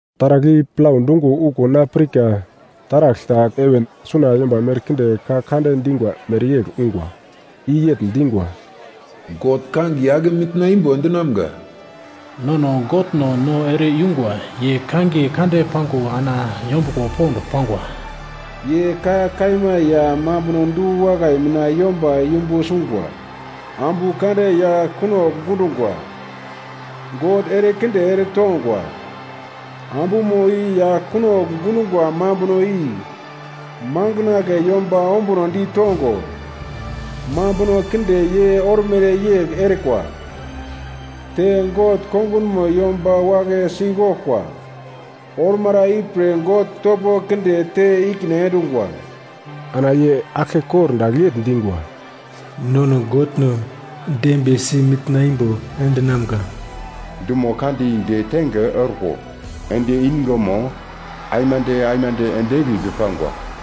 Taragl i plau dungo okuwo na pirka taragl ta heven suna yomba merkinde ka kande dingwa mereyegl ungwa! I yegl dingwa: “God kangiye ake mitna imbo endinamga! Nono Godno no ere-yungwa, ye kangiye kande pango ana yombuglo pond pangwa. Ye ka kaima ya mambuno du-wakai mina yomba yumbu sungwa, ambu kande yagl kunogl gundungwa. God erekinde eretongwa. Ambumo i yagl kunogl gundungwa mambuno i makandle yomba ombuno ditongo mambuno kinde ye ormere yegl erikwa, te God kongunmo yomba wagle sigoglkwa. Ormara ipre God topo kinde te ikine endungwa.” Ana ye aglke kordagl yegl dingwa: “Nono Godno dembiyesi mitna imbo endinamga! Dumo kande i detenge orko endi ingemo aimande aimande ende egli pi pangwa.”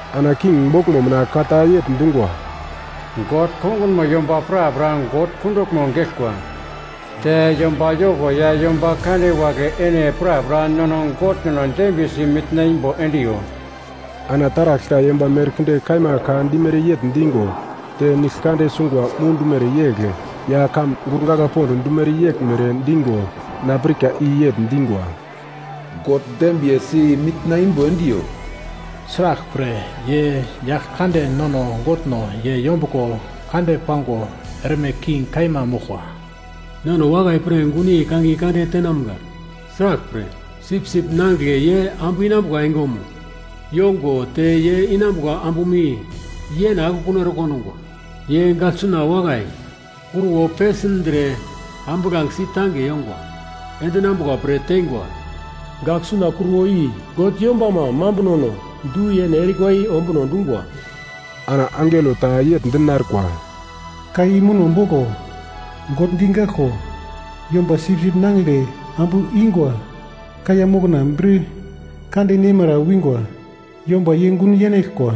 Ana king boglmo mina ka ta yegl dungwa: “God kongunmo yomba prapra God kunduglmo geglkwa, te yomba yoko ya yomba kande wagle ene prapra nono Godno dembiyesi mitna imbo endiyo!” Ana taragl ta yomba merkinde kaima ka dimere yegl digo te nigl kande sungwa mudumere yegl ya kamun gurgagla pond dumere yeglmere digo na pirka i yegl dingwa: “God dembiyesi mitna imbo endiyo, sraglpre, ye Yaglkande nono Godno ye yombuglo kande pango erme king kaima moglkwa. Nono wakai pir gunyei kangiye kande tenamga! Sraglpre, Sipsip Nangigle ye ambu inambuka engemo yongo te ye inambuka ambumo i yene akekun ere kondungwa. Ye gagl suna wakai kruwo pesindre ambuglangesi tange yongwa endinambuka pre teingwa! Gagl suna kruwo i God yombama mambunono du-yene erikwa i ombuno dungwa.” Ana angelo ta yegl dinarkwa, “Ka i muno boglo, ‘God digaglko yomba Sipsip Nangigle ambu ingwa kaiya mokna bir kande nemara wingwa yomba ye gun yenaglkwa.’”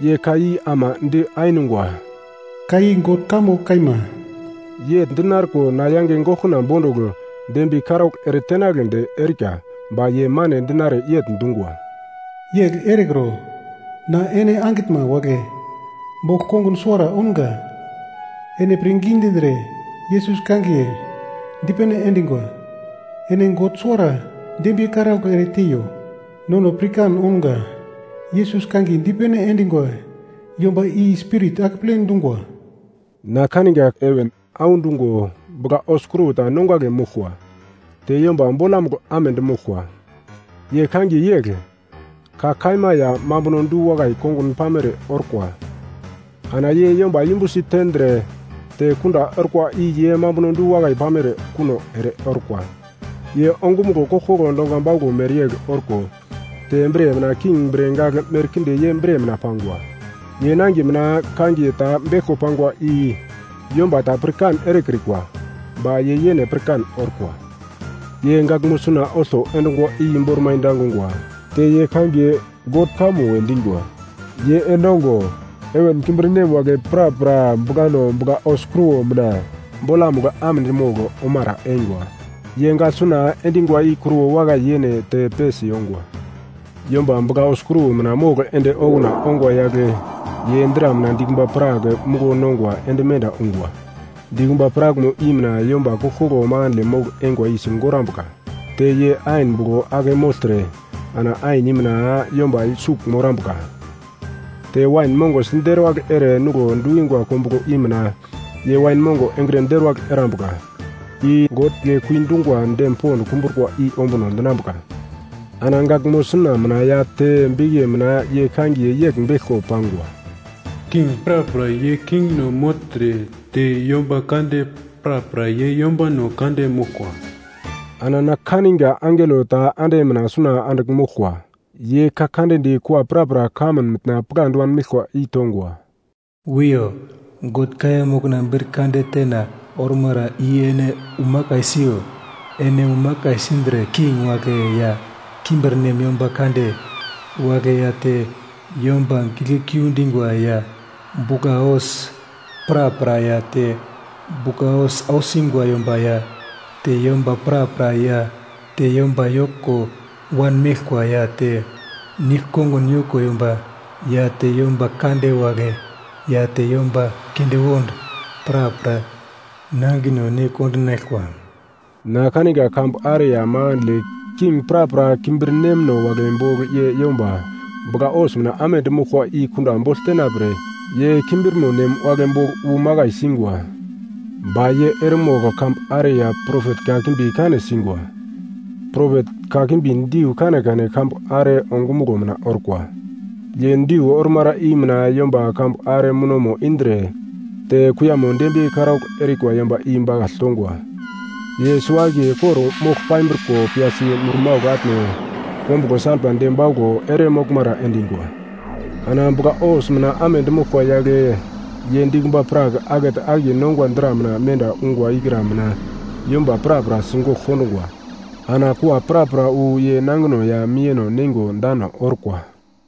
Ye ka i ama di ainungwa, “Ka i God kamo kaima.” Yegl dinarko na yange goglkona bondugl dembiye karaugl ere tenagledi erika, ba ye mane dinare yegl dungwa, “Yegl erekro! Na ene angitnma wagle bogl kongun suwara ounga, ene pirngi dindre Yesus kangiye dipene endingwa. Ene God suwara dembiye karaugl ereteiyo, nono pirkan ounga, Yesus kangiye dipene endingwa yomba i Spirit akeple dungwa.” Na kaninga heven audungo bugla-hos kruwo ta nongagle moglkwa, te yomba bolamugl amedi moglkwa, ye kangiye yegl, “Ka Kaima ya Mambuno Du-wakai Kongun Pamere Orkwa,” ana ye yomba yumbusi tendre te kunda orkwa i ye mambuno du-wakai pamere kuno ere orkwa. Ye ongumuglo koglkoglo donga bauglo mereyegl orko te bre mina king bre gagl merkinde ye bre mina pangwa. Ye nangiye mina kangiye ta beglko pangwa i yomba ta pirkan erekrikwa, ba ye yene pirkan orkwa. Ye gaglmo suna olto endungwa i bormai dangungwa, te ye kangiye “God Kamo” we dingwa. Ye endongo, heven kimbirnem wagle prapra buglano bugla-hos kruwo mina bolamugl amedi mogl omara eingwa, ye gaglsuna endingwa i kruwo wakai yene te pesi yongwa. Yomba bugla-hos kruwo mina mogl ende okuna ongwa yagle ye dra mina dikumba prak muglo nongwa ende menda ungwa. Dikumba prakmo i mina yomba koglkoglo makandle mogl-eingwa i sigorambuka. Te ye ain buglo ake mogltre ana ain i mina yomba sugl morambuka, te wain mongo siderwagl ere nuglo dukingwa kombuglo i mina ye wain mongo engre deruwagl erambuka. I God Giglekui dungwa dem pond kumbrukwa i ombuno dinambuka. Ana gaglmo suna mina ya te bikiye mina ye kangiye yegl beglko pangwa: King prapra ye kingno mogltre te yomba kande prapra ye yombano kande moglkwa. Ana na kaninga angelo ta ande mina suna andigl moglkwa. Ye ka kande di kua prapra kamun mitna pigladi wanmeglkwa i tongwa, “Wiyo, God kaiya mokna bir kande tena ormara i ene umakai siyo. Ene umakai sindre, king wagle ya kimbirnem yomba kande wagle ya te yomba giglekui dingwa ya bugla-hos prapra ya te bugla-hos ausingwa yomba ya te yomba prapra ya te yomba yoko wanmeglkwa ya te nigl-kongun yoko yomba ya te yomba kande wagle ya te yomba kindewond prapra nangino ne kondinaglkwa.” Na kaninga kambu are ya makandle king prapra kimbirnemno wagle bogl ye yomba bugla-hos mina amedi moglkwa i kunda bogl tenapre ye kimbirmo nem wagle bogl wu makai singwa. Ba ye eremogl kambu are ya propet kakimbi kane singwa, propet kakimbi diu kanekane kambu are ongumuglo mina orkwa. Ye diu ormara i mina yomba kambu are munomo indre te kuiyamo dembiye karaugl erikwa yomba i bakagl tongwa. Ye suwo-akiye kor-mogl pambriko piyasi murmaugl atne kombuglo salpa de bauglo ere moglmara endingwa. Ana bugla-hos mina amedi moglkwa yagle ye dikumba prak akete akiye nongwa dra mina menda ungwa ikra mina yomba prapra sigogl kondungwa. Ana kua prapra wu ye nangino ya miyeno neingo dano orkwa.